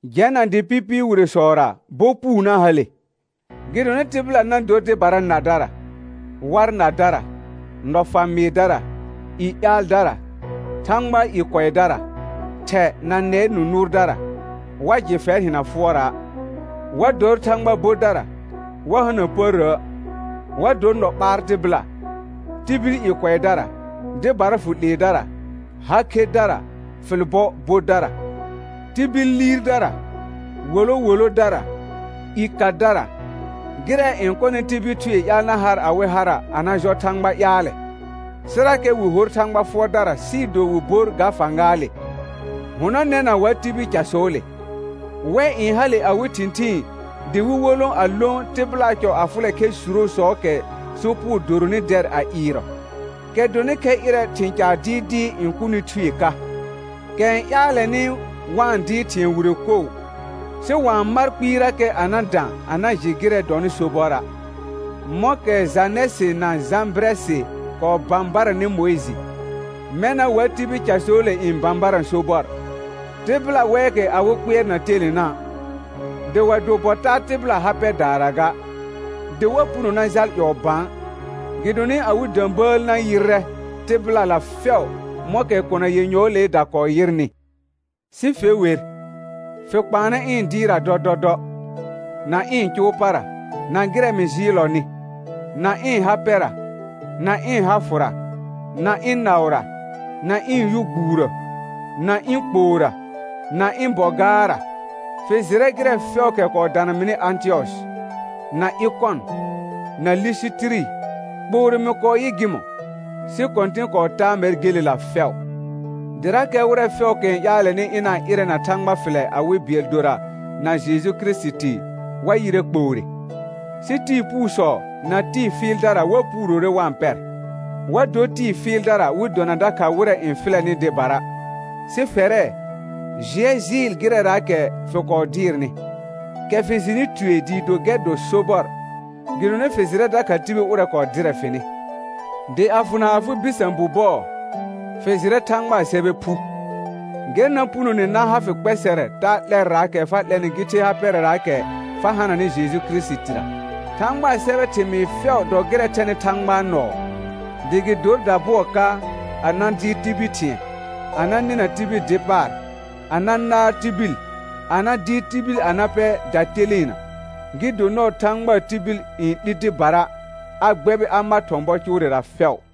Jɛna dɩ pɩpɩɩ wiresɔra bɔ puu na hale. Gɩdonɩ tɩbɩla na dor dɩbara nadara, war nadara, nɔfa mɩɩdara, i yaaldara, Thãgbaa i kʋɛdara, thɛ na nɛɛ nũ nʋʋrdara, wa jɩ fɛr hɩna fʋɔra', wa dor Thãgba bodara, wa hana pərrə', wa dor nɔ ɓaar tɩbɩla, tibil i kʋɛdara, dɩbara fʋ 'leedara, ha khedara, fɩl bɔ bodara, tibil liirdara, wolo wolodara, i kadara, gɩrɛ n kɔnɩ tibil thuee ƴaal na har awɩ hara a na jɔ Thãgba ƴaalɛ; sɩrakɛ wɩ hor Thãgba fʋɔrdara sɩɩ do wɩ bor ga fãgaale. Hʋnɔnɛna wa tibil casɔɔle. Wɛ n hale awɩ thɩ̃thɩɩn dɩ wɩ wolõ a lõ tɩbɩlaa cɔ a fʋlɛ khɛr surosɔɔkɛ sopugo doronɩ dɛr a ɩɩrɔ, kɛ dɔnɩ khɛ ƴɩrɛ thɩ̃ caar dɩɩdɩɩ n kʋnɩ thue ka, kɛ n ƴaalɛnɩ wa-n dɩɩr thɩ̃ɛ wire koo, sɩ wa-n mar kpɩɩrakɛ a na dã a na jɩ gɩrɛ dɔnɩ sobɔra'. Mɔ̃kɛ Janɛsɩ na Jãbɩrɛsɩ kɔɔ bãbaranɩ Mʋɩjɩ, mɛna wa tibil casɔɔle n bãbarã sobɔr. Tɩbɩla wɛɛkɛ awɩ kpɩɛr na telena', dɩ wa do bɔ taa tɩbɩla ha pɛdaara ga. Dɩ wa puno na jal ƴɔɔ bã, gɩdonɩ awɩ də̃bəəl na yɩrrɛ tɩbɩlala fɛʋ mɔ̃kɛ kona yenyɔɔleeda kɔɔ yɩrnɩ. Sɩ fe wer, fɩ kpaanɛ ɩ̃ dɩɩrra dɔdɔdɔ, na ɩ̃ cʋʋ para, na gɩrɛ mɩ jɩɩllɔnɩ, na ɩ̃ ha pɛra, na ɩ̃ ha fʋra, na ɩ̃ naʋra, na ɩ̃ yʋ gbuurə, na ɩ̃ kpoora, na ɩ̃ bɔ gaarra. Fɩ jɩrɛ gɩrɛ fɛʋʋkɛ kɔɔ dana mɩnɩ Ãtɩyɔsɩ, na Ɩkɔn, na Lisitiri, kpoore mɩ kɔɔ yɩ gɩmɔ̃, sɩ Kɔ̃tɩn kɔɔ taa mɛr gelela fɛʋ. Dɩrakɛ wɩrɛ fɛʋʋkɛ n ƴaalɛnɩ ɩna-n ɩrɛ na Thãgba fɩlɛ awɩ bɩɛl dora na Jeju Kirisiti, wa yɩrɛ kpoore. Sɩ tɩɩ puusɔ na tɩɩ fɩɩldara wa puurore wa-n pɛr, wa dor tɩɩ fɩɩldara wɩ dona dakha wɩrɛ n fɩlɛnɩ dɩbara. Sɩ fɛrɛ, jɩɛ jɩɩl gɩrɛraakɛ fɩ kɔɔ dɩɩrnɩ, kɛ fɩ jɩnɩ tue dɩɩ do gɛr dɔ sobɔr, gɩdonɩ fɩ jɩrɛ dakha tibil ʋrɛ kɔɔ dɩrɛ fɩnɩ. Dɩ a fʋna afɩ bɩsã bu bɔɔ, fɩ jɩrɛ Thãgbaa sɛbɛ phu, gɛr na punone na ha fɩ kpɛsɛrɛ taa 'lɛrraakɛ fa 'lɛnɩ gɩ the ha pɛrɛraakɛ fa hananɩ Jeju Kirisitira. Thãgbaa sɛbɛɛ thɩmɩɩ fɛʋ dɔ gɩrɛ thɛnɩ Thãgbaa nɔɔ, dɩ gɩ dor dabʋɔ ka a na dɩɩr tibil thɩ̃ɛ, a na nɩna tibil dɩ paar, a na naar tibil, a na dɩɩr tibil a na pɛ dateleena, gɩ do nɔɔ Thãgbaa tibil n 'li dɩbara, a gbɛbɩ a ma thɔ̃ bɔ cʋʋrɛra fɛʋ.